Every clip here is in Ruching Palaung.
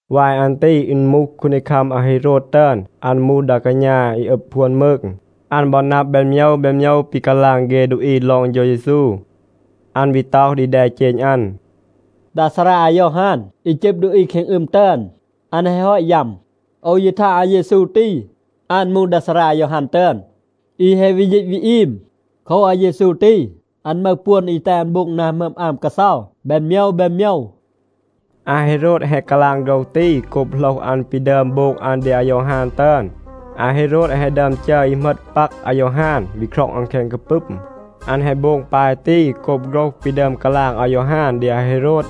วาย อัน ตี อึณ มูห คูนดีคัม อาเฮโรด ตึอน. อัน มูห ดา กาณา อี อึบ พวน มืง. อัน บอ นับ แบน โมยว แบน โมยว ปี กาลาง เฆ ดูอี ลอง เฌา เยซู. อัน วี ต็อห ดี แดเจณ อัน, “ดา ซารา อายอฮาน อี จึบ ดูอี แคง อึม ตึอน, อัน แฮะ ฮอต ยัม. โอว ยี ทาง อาเยซู ตี, อัน มูห ดา ซารา อายอฮาน ตึอน, อี แฮะ วี ยีต วี อีม. โคว, อาเยซู ตี, อัน มึห ปวน อี แตห อัน โบง นา หมึอม อาม กาเซา แบน โมยว แบน โมยว.” อาเฮโรด แฮะ กาลาง โฆรห ตี โกบ โหลห อัน ปี ดึอม โบง อัน ดี อายอฮาน ตึอน. อาเฮโรด แฮะ ดึอม จัร อี เหมต ปัก อายอฮาน, วี คร็อง อัน แคง กาปึม. อัน แฮะ โบง ปาย ตี โกบ โฆรห ปี ดึอม กาลาง อายอฮาน ดี อาเฮโรด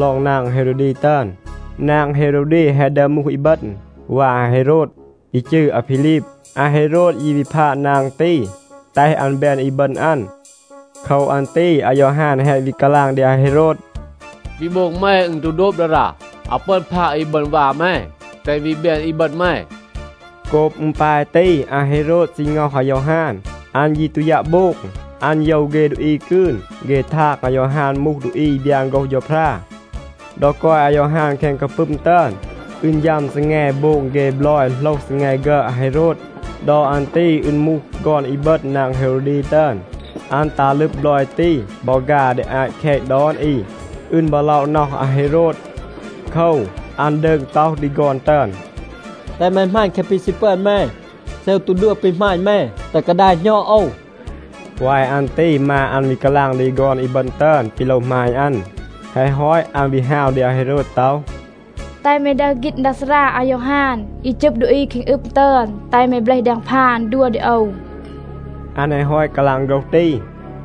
ลอง นาง เฮโรวดี ตึอน. นาง เฮโรวดี แฮะ ดึอม มูห อีบึณ วา อาเฮโรด อี จืร อาพีลีบ. อาเฮโรด ยี วี พาด นาง ตี, แตห อัน แบน อีบึณ อัน. โคว อัน ตี อายอฮาน แฮะ วี กาลาง ดี อาเฮโรด, “ปี โบง แม, อึณ ตู โดบ ดารา. อาว ปึอน พาด อีบึณ วา แม, แตห อัน วี แบน อีบึณ แม.” โกบ อึณ ปาย ตี, อาเฮโรด ซี ง็อห อายอฮาน. อัน ยี ตู ยัะ โบง. อัน โยว เฆ ดูอี กืน. เฆ ทาง, อายอฮาน มูห ดูอี อี บยาน โฆรห เฌาพรา. ดอ กอย อายอฮาน แคง กาปึม ตึอน, อึณ ฌัม ซีแง โบง เฆ บลอย โหลห ซีแง ฆึอด อาเฮโรด. ดอ อัน ตี อึณ มูห ฆอน อีบึณ นาง เฮโรวดี ตึอน. อัน ตัห ลึบ บลอย ตี บอ ฆา ดี อาต แคต ดอน อี. อึณ บอ ล็อะ น็อห อาเฮโรด. โคว, อัน ดืง ต็อห ดี ฆอน ตึอน, “แตห แม หมาณ แคะ ปี ซี ปึอน แม. เซ โอว ตู ดัว ปี หมาณ แม, แตห กาดาย หณอด โอว.” วาย อัน ตี มา อัน วี กาลาง ดี ฆอน อีบึณ ตึอน ปี โลว หมาณ อัน. แฮะ ฮอต อัน วี ฮาว ดี อาเฮโรด ต็อห, “แตห แม ดึห ฆีณ ดา ซารา อายอฮาน, อี จึบ ดูอี แคง อึม ตึอน. แตห แม เบลห แดง พาน, ดัว ดี โอว.” อัน แฮะ ฮอต กาลาง โฆรห ตี,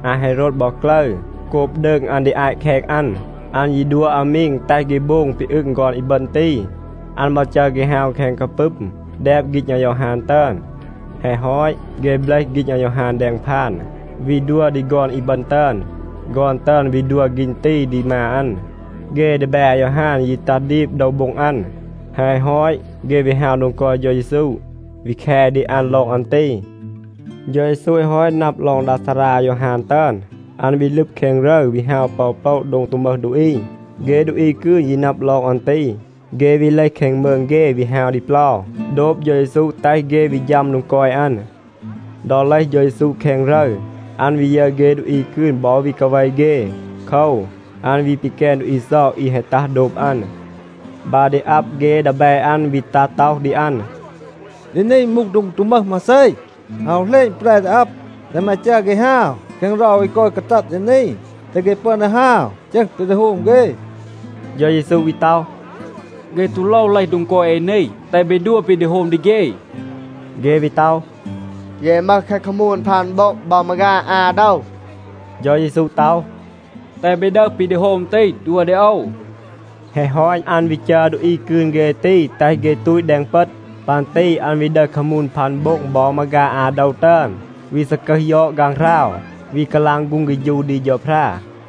อาเฮโรด บอ กลึร. โกบ ดืง อัน ดี อาต แคต อัน, อัน ยี ดัว อามีง, แตห เฆ โบง ปี อึง ฆอน อีบึณ ตี. อัน บอ จัร เฆ ฮาว แคง กาปึม, แดบ ฆีณ อายอฮาน ตึอน. แฮะ ฮอต, เฆ เบลห ฆีณ อายอฮาน แดง พาน, วี ดัว ดี ฆอน อีบึณ ตึอน. ฆอน ตึอน วี ดัว ฆีณ ตี ดี มา อัน. เฆ ดีแบ อายอฮาน ยี ตัห ดีบ โดว โบ็ง อัน. แฮะ ฮอต, เฆ วี ฮาว โดง กอย เฌา เยซู, วี แค ดี อัน ลอง อัน ตี. เฌา เยซู แฮะ ฮอต นับ ลอง ดา ซารา อายอฮาน ตึอน, อัน วี ลึบ แคง รึร, วี ฮาว ปอ อู โปละ โดง ตู มึห ดูอี. เฆ ดูอี กืน ยี นับ ลอง อัน ตี, เฆ วี เลห แคง มืง เฆ, วี ฮาว ดี เปลา, โดบ เฌา เยซู, แตห เฆ วี ฌัม โดง กอย อัน. ดอ เลห เฌา เยซู แคง รึร, อัน วี ยึร เฆ ดูอี กืน บอ วี กาเว เฆ. โคว, อัน วี ปีแกน ดูอี เซา อี แฮะ ตัห โดบ อัน. บา ดี อับ, เฆ ดีแบ อัน วี ตัห ต็อห ดี อัน, “ดี นี มูห โดง ตู มึห มาเซ. อาว เหลณ แปร ดี อับ. แตห แม จัร เฆ ฮาว แคง เรา อี กอย กาตัด ดี นี, แตห เฆ ปึอน ดี ฮาว จึห ปี ดี โฮม เฆ.” เฌา เยซู วี ต็อห, “เฆ ตู โลว เลห โดง กอย เอ นี. แตห เบ ดัว ปี ดี โฮม ดี เฆ.” เฆ วี ต็อห, “เย มึห แคะ คามูน พัน โบ็ง บอ มาฆา อา โดว.” เฌา เยซู ต็อห, “แตห เบ ดึห ปี ดี โฮม ตี, ดัว ดี โอว.” แฮะ ฮอต, อัน วี จัร ดูอี กืน เฆ ตี, แตห เฆ ตูต แดง เปต. ปัน ตี อัน วี ดึห คามูน พัน โบ็ง บอ มาฆา อา โดว ตึอน, วี ซากึห ยอด ฆางหราว, วี กาลาง ฆูง เฆฌู ดี เฌาพรา.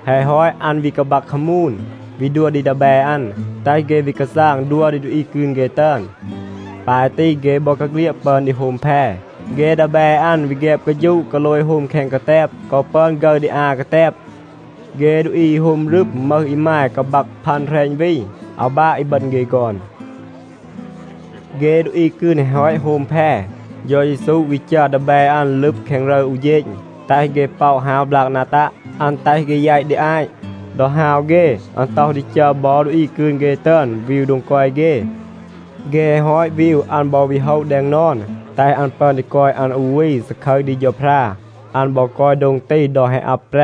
แฮะ ฮอต, อัน วี กาบัก คามูน, วี ดัว ดี ดีแบ อัน, แตห เฆ วี กาซาง ดัว ดี ดูอี กืน เฆ ตึอน. ปาย ตี, เฆ บอกาเฆลียด ปึอน ดี โฮม แพ. เฆ ดีแบ อัน วี แฆบ กาฌูะ กาโลย โฮม แคง กาแตบ, กอ ปึอน ฆึร ดี อา กาแตบ. เฆ ดูอี อี โฮม รึม มึห อีมาย กาบัก พัน แหรณ วี, อาว บาะ อีบึณ เฆ ฆอน. เฆ ดูอี กืน แฮะ ฮอต โฮม แพ, เฌา เยซู วี จัร ดีแบ อัน ลึบ แคง รึร อู เฌณ, แตห เฆ ป็อะ ฮาว บลาก นา ตัะ. อัน แตห เฆ แยต ดี อาต. ดอ ฮาว เฆ, อัน ต็อห ดี จัร บอ ดูอี กืน เฆ ตึอน วีว โดง กอย เฆ. เฆ แฮะ ฮอต วีว, อัน บอ วี โฮะ แดง นอน, แตห อัน ปึอน ดี กอย อัน อู วี, ซาคึร ดี เฌาพรา. อัน บอ กอย โดง ตี ดอ แฮะ อับ แปร.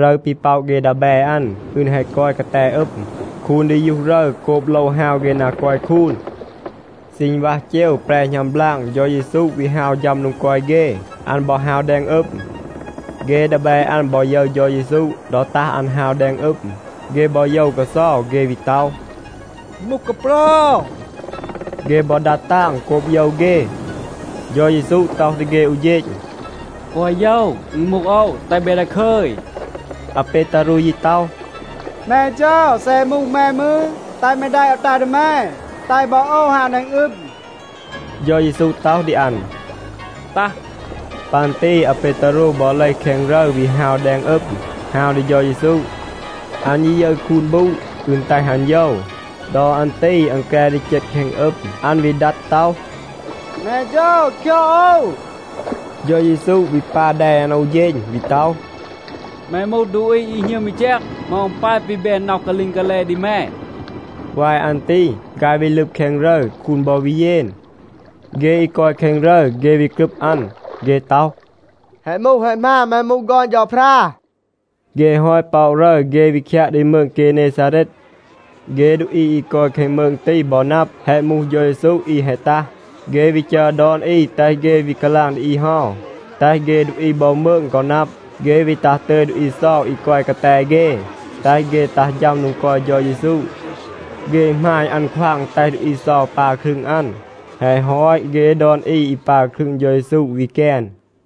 รึร ปี ป็อะ เฆ ดีแบ อัน, อึณ แฮะ กอย กาแต อึม. คูน ดียูห รึร โกบ โลว ฮาว เฆ นา กอย คูน. ซีณวัห เจว, แปร หณัม บลาง, เฌา เยซู วี ฮาว ฌัม โดง กอย เฆ. อัน บอ ฮาว แดง อึม. เฆ ดีแบ อัน บอ ยึร เฌา เยซู ดอ ตัห อัน ฮาว แดง อึม, เฆ บอ โยว กาเซา. เฆ วี ต็อห, “อึณ มูห กาเปรา.” เฆ บอ ดัด ตาง โกบ โยว เฆ. เฌา เยซู ต็อห ดี เฆ อู เฌณ, “แกวะ โยว. อึณ มูห โอว. แตห เบ ดาคึย.” อาเปตารู ยี ต็อห, “แม เฌา, เซ แฮะ มูห แม มืร, แตห แม แดะ โอว ตัห ดี แม, แตห บอ โอว ฮาว แดง อึม.” เฌา เยซู ต็อห ดี อัน, “ตัห.” ปัน ตี อาเปตารู บอ เลห แคง รึร, วี ฮาว แดง อึม, ฮาว ดี เฌา เยซู. อัน ยี ยึร คูน บูด. อึณ แตห อัน โยว. ดอ อัน ตี อัน แกร ดี เจต แคง อึม. อัน วี ดัด ต็อห, “แม เฌา, คยอด โอว.” เฌา เยซู วี ปา แด อัน อู เฌณ, วี ต็อห, “แม มูห ดูอี อี หณึม อี แจก, เหมา อึณ ปาย ปี แบน น็อห กาลีง กาแล ดี แม?” วาย อัน ตี ฆาย วี ลึบ แคง รึร. คูน บอ วี เยน. เฆ อี กอย แคง รึร, เฆ วี กรึบ อัน. เฆ ต็อห, “แฮะ มูห แฮะ หมาน, แม มูห ฆอน เฌาพรา.” เฆ แฮะ ฮอต ป็อะ รึร, เฆ วี คยัะ ดี มืง เกเนซาเรด. เฆ ดูอี อี กอย แคง มืง ตี บอ นับ, แฮะ มูห เฌา เยซู อี แฮะ ตัห, เฆ วี จัร ดอน อี แตห เฆ วี กาลาง ดี อี เฮา, แตห เฆ ดูอี บอ มืง กอ นับ. เฆ วี ตัห ตึย ดูอี เซา อี กอย กาแต เฆ, แตห เฆ ตัห ฌัม โดง กอย เฌา เยซู. เฆ หมาณ อัน ควาง แตห ดูอี เซา ปา ครึง อัน. แฮะ ฮอต, เฆ ดอน อี อี ปา ครึง เฌา เยซู วี แกน.